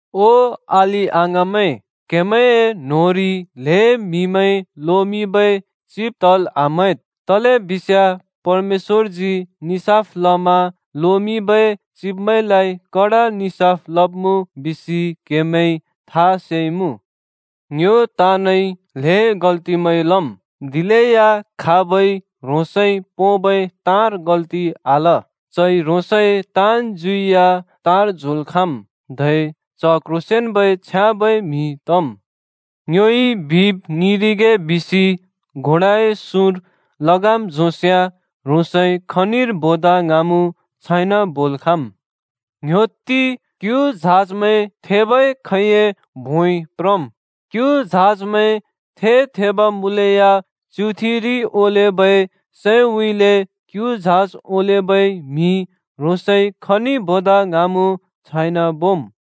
ओ अलि-अङाँमैं, क्‍हेमैंए न्होंरि ल्‍हें म्‍हिमैं लोमिंबै चिब तल् आम्‍हैद्, तलेबिस्याँ परमेश्‍वरजी निसाफ लमा लोमिंबै चिब्मैंलाइ कडा निसाफ लब्मुँ बिसि क्‍हेमैंइ था सेइमुँ। ङ्यो ताँनइ ल्‍हें गल्तिमैं लम्, दिलेया खाबइ ह्रोंसइ पोंबै ताँर गल्ति आल, चइ ह्रोंसए ताँन् ज्युइ या तार झोंल् खाँम्, धै च क्ह्रोंसेंन्बै छ्याँबै म्हि तम्। ङ्योइ बिब ङिंरिगे बिसि घोडाए सुँर लगाम झोंस्‍याँ ह्रोंसइ खनिर बोदा ङ्हाँमुँ छाइन बोल् खाँम्। ङ्ह्‍योत्ति, क्यु झाजमैं थेबै खैंए भोंइ प्रम्। क्यु झाजमैं थे-थेब मुँलेया च्‍युथिरि ओलेबै सैउँइँले क्यु झाज ओलेबै म्‍हिइ ह्रोंसइ खनि बोदा ङ्हाँमुँ छाइन बोम्।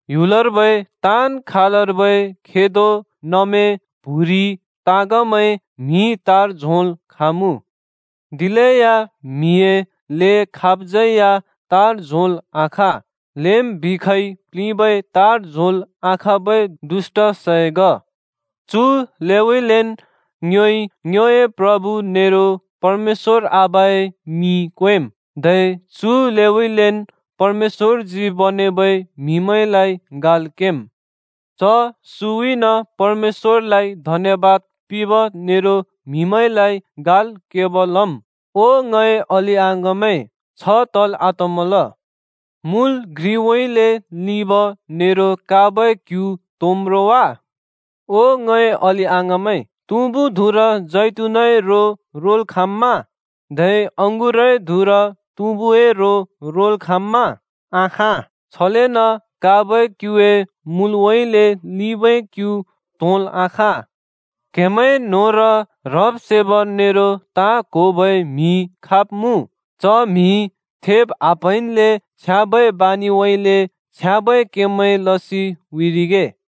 ह्‍युलर्बै ताँन् खालर्बै खेदो, नमे, प्‍हुरि, ताँगमैं म्‍हिइ तार झोंल् खाँमुँ। दिलेया म्हिए ले खाबज्‍यै या तार झोंल् आखाँ। लेम् बिखइ प्लिंबै तार झोंल् आखाँबै दुष्‍ट सै ग। चु लेउँइँलेन् ङ्योइ ङ्योए प्रभु नेरो परमेश्‍वर आबाए मिं क्वेम्, धै चु लेउँइँलेन् परमेश्‍वरजी बनेबै म्‍हिमैंलाइ गाल् केम्। च सुँउँइन परमेश्‍वरलाइ धन्यबाद पिंब नेरो म्हिमैंलाइ गाल् केब लम्। ओ ङए अलि-अङाँमैं, छ तल् आतमल। मुल घ्रिउँइँले लिंब नेरो काँबै क्‍यु त्‍होंम् रो वा? ओ ङए अलि-अङाँमैं, तुँबु धुँर जैतुनए रो रोल् खाँम्‍मा? धै अँगुरए धुँर तुँबुए रो रोल् खाँम्‍मा? आखाँ! छलेन काँबै क्‍युए मूलउँइँले लिंबै क्‍यु त्होंल् आखाँ। क्हेमैं न्होंर ह्रब्-सेब नेरो ताँ क्‍होबै म्‍हि खाब मुँ? च म्‍हिइ थेब् आप्‍हैंन्‍ले छ्याँबै बानिउँइँले छ्याँबै केमैं लसि उँइँरिगे।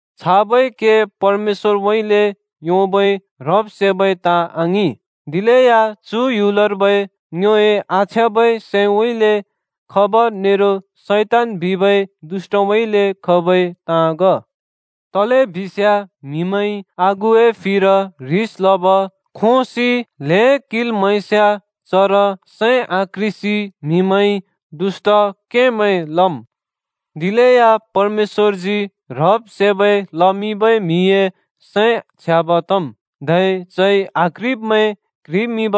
छाबै के परमेश्‍वरउँइँले योंबै ह्रब्-सेबै ताँ आङिं। दिलेया चु ह्‍युलर्बै, ङ्योए आछ्याँबै सैंउँइँले खब नेरो शैतान बिबै दुष्‍टउँइँले खबै ताँ ग। तलेबिस्याँ म्हिमैंइ आगुए फिर ह्रिस लब, खोंसि ल्हें किंल् म्‍हैस्याँ चर सैं आक्ह्रिसि म्हिमैंइ दुष्‍ट केमैं लम्। दिलेया परमेश्‍वरजी ह्रब्-सेबै लमिंबै म्‍हिए सैं छ्याँब तम्, धै चइ आक्ह्रिब्मैं क्ह्रिमिंब,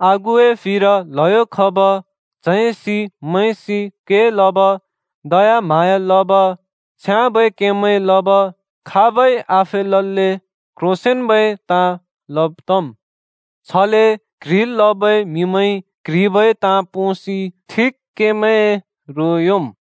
आगुए फिर ल्हयो खब, च्हैंसि मैंसि के लब, दयाम्हाँया लब, छ्याँबै केमैं लब, खाबै आफेलल्‍ले क्ह्रोंसेंन्बै ताँ लब तम्। छले क्ह्रिल् लबै म्‍हिमैंइ क्ह्रिबै ताँ पोंसि ठिक केमैंए रो योंम्।